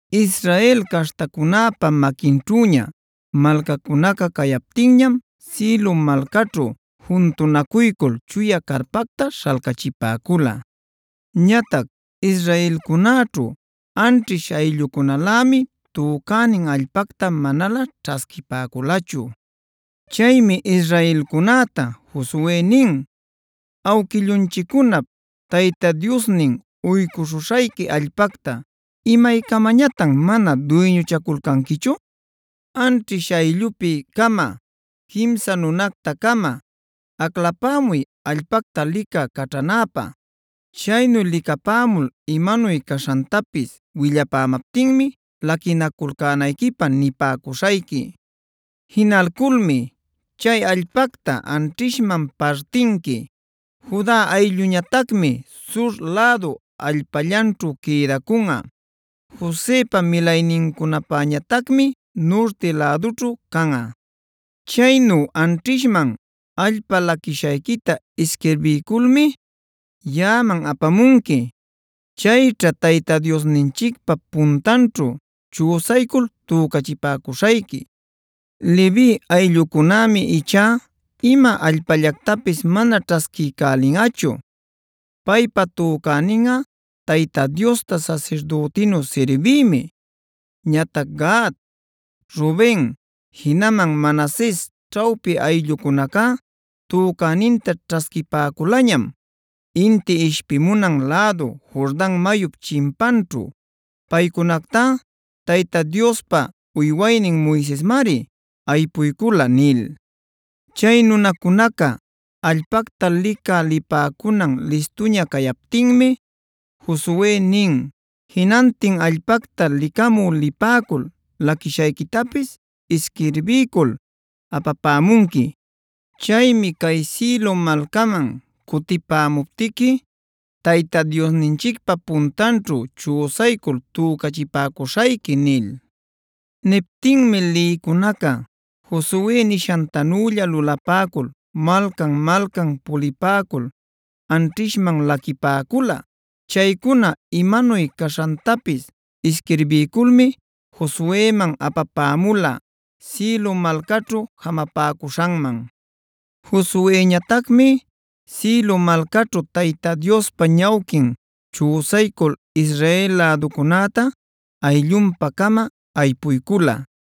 Israel caśhtacunäpa maquinćhüña malcacunaca cayaptinñam Silo malcaćhu juntunacuycul chuya carpacta śhalcachipäcula. Ñatac israelcunäćhu anćhish ayllucunalämi tücänin allpacta manalä ćhasquipäculachu. Chaymi israelcunäta Josue nin: “¿Awquillunchiccunap Tayta Diosnin uycuśhuśhayqui allpacta imaycamañatan mana duyñuchaculcanquichu? Anćhish ayllupi-cama quimsa nunacta-cama aclapämuy allpacta licä caćhanäpä. Chaynu licapämul imanuy caśhantapis willapämaptinmi laquinaculcänayquipä nipäcuśhayqui. Jinalculmi chay allpacta anćhishman partinqui. Juda aylluñatacmi Sur lädu allpallanćhu quïdacunꞌa. Josepa milaynincunapäñatacmi nurti lädućhu canꞌa. Chaynu anćhishman allpa laquishayquita isquirbiyculmi yaꞌaman apamunqui. Chayćha Tayta Diosninchicpä puntanćhu chüsaycul tücachipäcuśhayqui. Levi ayllucunämi ichá ima allpallactapis mana ćhasquiycälinꞌachu. Paypa tücäninꞌa Tayta Diosta sasirdütinu sirbiymi. Ñatac Gad, Ruben jinaman Manases ćhawpi ayllucunacá tücäninta ćhasquipäculañam, inti ishpimunan lädu Jordan mayup chimpanćhu. Paycunactá Tayta Diospa uywaynin Moisesmari aypuycula” nil. Chay nunacunaca allpacta licä lipäcunan listuña cayaptinmi Josue nin: “Jinantin allpacta licamü lipäcul laquishayquitapis isquirbiycul apapämunqui. Chaymi cay Silo malcaman cutipämuptiqui Tayta Diosninchicpa puntanćhu chüsaycul tücachipäcuśhayqui” nil. Niptinmi lïcunaca Josue nishantanülla lulapäcul malcan-malcan pulipäcul anćhishman laquipäcula. Chaycuna imanuy caśhantapis isquirbiyculmi Josueman apapämula Silo malcaćhu jamapäcuśhanman. Josueñatacmi Silo malcaćhu Tayta Diospa ñawquin chüsaycul Israel läducunäta ayllunpa-cama aypuycula.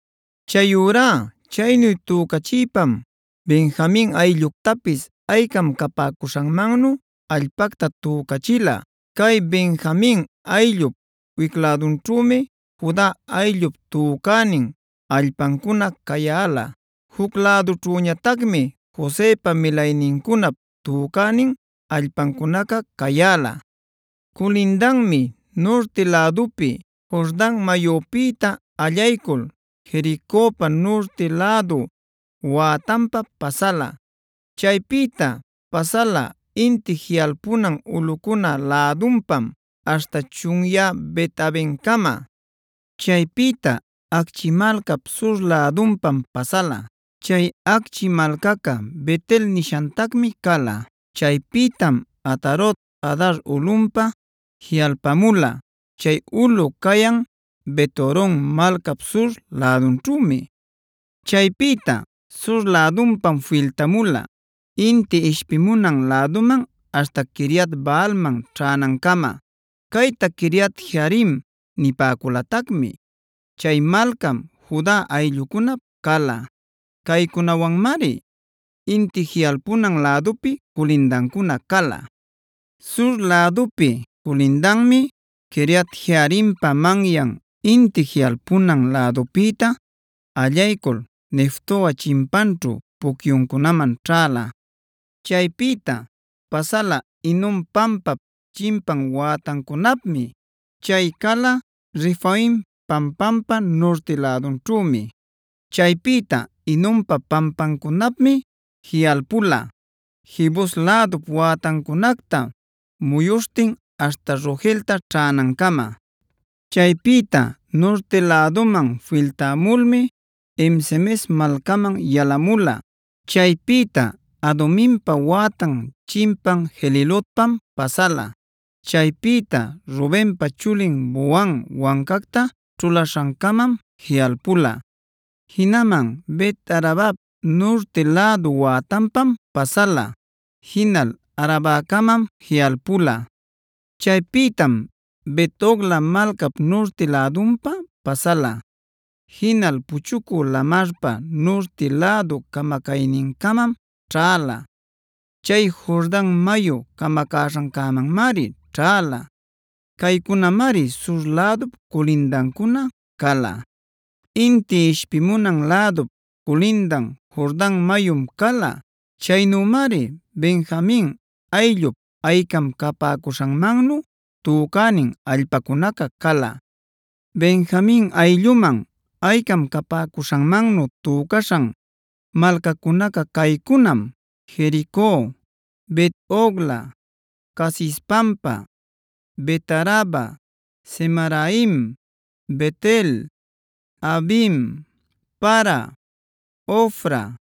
Chayurá chaynu tücachïpam Benjamin aylluctapis aycam capäcuśhanmannu allpacta tücachila. Cay Benjamin ayllup wic lädunćhümi Juda ayllup tücänin allpancuna cayäla; juc lädunćhüñatacmi Josepa milaynincunap tücänin allpacunaca cayäla. Culindanmi nurti lädupi, Jordan mayupïta allaycul Jericopa nurti lädu wätanpa pasala. Chaypïta pasala inti jiꞌalpunan ulꞌucuna lädunpam aśhta chunyä Bet-avencama. Chaypïta Acchi malcap sur lädunpam pasala. Chay Acchi malcaca Bet-el nishatacmi cala. Chaypïtam Atarot-adar ulꞌunpa jiꞌalpamula; chay ulꞌu cayan Bet-horon malcap sur lädunćhümi. Chaypïta sur lädunpam filtamula inti ishpimunan läduman aśhta Quiriat-baalman ćhänancama; cayta Quiriat-jearim nipäculatacmi. Chay malcam Juda ayllucunap cala. Caycunawanmari inti jiꞌalpunan lädupi culindancuna cala. Sur lädupi culindanmi Quiriat-jearimpa manyan inti jiꞌalpunan lädupïta allaycul Neftoa chimpanćhu pucyuncunaman ćhäla. Chaypïta pasala Hinom pampap chimpan wätancunapmi; chay cala Refaim pampampa nurti lädunćhümi. Chaypïta Hinompa pampancunapmi jiꞌalpula, Jebus lädup wätancunacta muyuśhtin aśhta Rogelta ćhänancama. Chaypïta nurti läduman filtamulmi En-semes malcaman yalamula. Chaypïta Aduminpa wätan chimpan Gelilotpam pasala. Chaypïta Rubenpa chulin Bohan wancacta ćhulaśhancamam jiꞌalpula. Jinaman Bet-arabap nurti lädu wätanpam pasala; jinal Arabacamam jiꞌalpula. Chaypïtam Bet-hogla malcap nurti lädunpa pasala; jinal Puchucü Lamarpa nurti lädu camacaynincamam ćhäla; chay Jordan mayu camacaśhancämanmari ćhäla. Caycunamari sur lädup culindancuna cala. Inti ishpimunan lädup culindan Jordan mayum cala. Chaynümari Benjamin ayllup aycam capäcuśhanmannu tücänin allpacunaca cala. Benjamin aylluman aycam capäcuśhanmannu tücaśhan malcacunaca caycunam: Jerico, Bet-hogla, Casis pampa, Bet-araba, Zemaraim, Bet-el, Avim, Para, Ofra,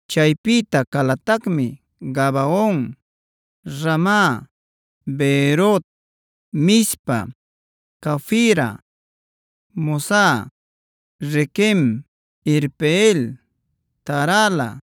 Chaypïta calatacmi: Gabaon, Rama, Beerot, Mizpa, Cafira, Mozah, Requem, Irpeel, Tarala,